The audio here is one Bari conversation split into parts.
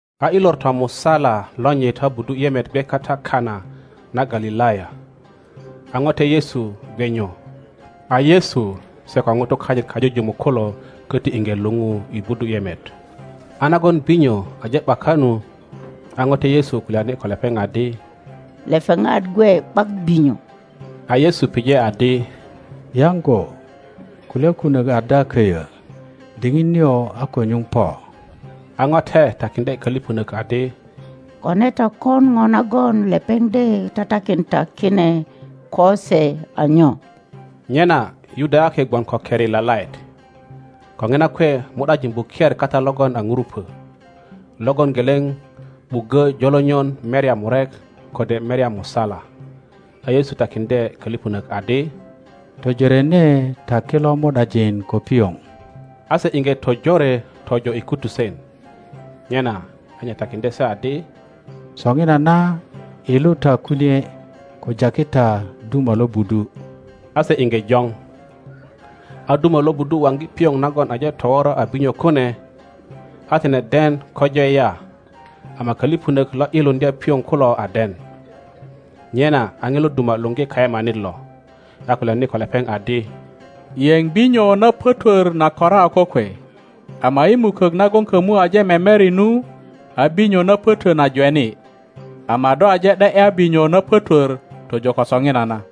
A i lor tomusala lonyit a buduyemet gwe kata Kanana Galilaya, a ŋote Yesu gwe nyu. A Yesu se ko nutu kanyit kajujumuk kulo köti iŋge luŋu i budu yemet. A nagon binyo aje ’baka nu, a note Yesu kulyani ko lepeŋ adi, Lepeŋat gwe ’bak binyo. A Yesu pije adi, Yaŋgo, kulya kunok ada köyö? Diŋit nio a ko nyuŋ po. A ŋote takiŋdye koliponök adi, Kone ta kon ŋo nagon lepeŋ de tatakin ta kine ko se a nyo. Nyena Yudayaki gwon ko keri lalaet. Ko ŋina kwe mu ’dajin buker kata logon a ŋurupo, logon geleŋ ’buggö jolonyon merya murek kode merya musala. A Yesu takiŋdye kölipönök adi, Tojorene ta kilo mu ’dajin ko pioŋ. A se iŋge tojore tojo i kutusen. Nyena a nye takiŋdye se adi, Soŋinana ’yilu ta kunie, ko jaki ta duma lo budu. A se iŋge joŋ. A duma lo budu waŋgi pioŋ nagon aje towora a binyo kune, a tine den ko jwe ya ama koliponök lo ’yiluŋdya pioŋ kulo a den. Nyena a ŋilo duma luogi kayemanit lo, a kulyani ko lepeŋ adi, Yeŋ binyo na pötwör na kora a kokwe, ama i mukok nagon kömu aje memeri nu a binyo na pötö na jweni; ama do aje ’de ’ya binyo na pötwör tojo ko soŋinana.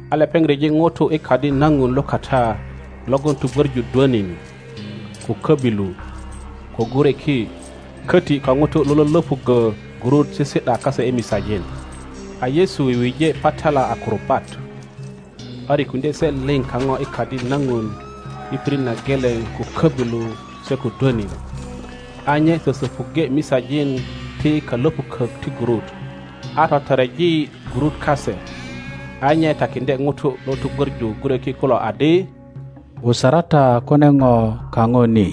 A lepeŋ ryeji ŋutu i Kadi na Ŋun lukata logon tugwöŋu dwönin, ko köbilu, ko gureki, köti ko ŋutu lo lölöpuggö gurut sisi ’da kase i misajin. A Yesu wiwije patala a kurubat, a rikuŋdye se lio kaŋo i Kadi na ŋun i pirit na geleŋ ko köbilu se ko dwönin, a nye sösöpuŋge misajin ti kalöpukök ti gurut, a totoreji gurut kase. A nye takiŋdye ŋutu lo tugwöŋu gureki kulo adi, Wusara ta kune Ŋo kaŋo ni;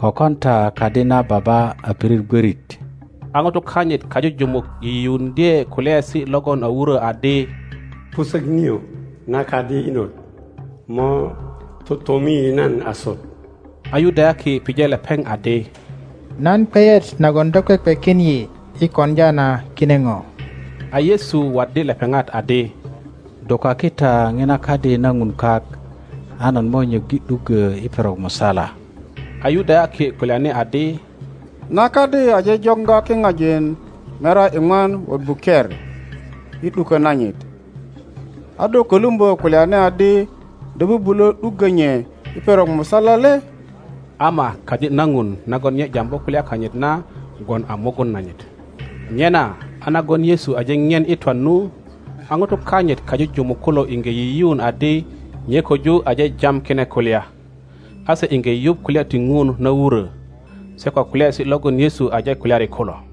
ko kon ta kadi na Baba a pirit gwörit. A ŋutu kanyit kajujumuk yiyiuŋdye kulyaesi logon a wurö adi, Pusök nio na kadi inot mo totomi nan asut. A Yudayaki pije lepeŋ adi, Nan kweyet nagon do kwekwekin yi i koŋdya na kine ŋo? A Yesu waddi lepeŋat adi, Dukaki ta ŋina kadi na Ŋun kak, a nan mo nyöggi ’duggo i perok musala. A Yudayaki kulyani adi, Na kadi aje joŋga kiŋajin merya iŋwan wot buker i ’dukö nanyit, a do kölumbö kulyani adi do bubulö ’duggö nye i perok musala le? Ama kadi na ŋun nagon nye jambu kulya kanyit na gwon a mugun nanyit. Nyena a nagon Yesu aje ŋien i twan nu, a ŋutu kanyit kajujumuk kulo iŋge yiyiun adi nye köju aje jam kine kulya; a se iŋge yuŋ kulya ti Ŋun na wurö, se ko kulyaesi logon Yesu aje kulyari kulo.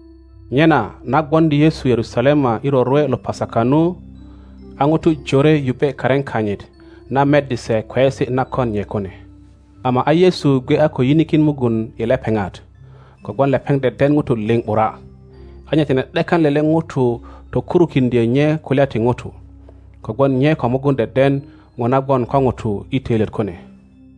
Nyena na gwoŋdi Yesu Yerusalemai rorwe lo Pasaka nu, a ŋutu jore yubbe karin kanyit, na meddi se kweyesi na kon nye kune. Ama a Yesu gwe a ko yinikin mugun i lepeŋat, kogwon lepeŋ deden ŋutu liŋ ’bura, a nye tine ’dekan lele ŋuto tokurukiŋdyö nye kulya ti ŋutu, kogwon nye ko mugun deden ŋo na gwon ko ŋutu i töilyet kune.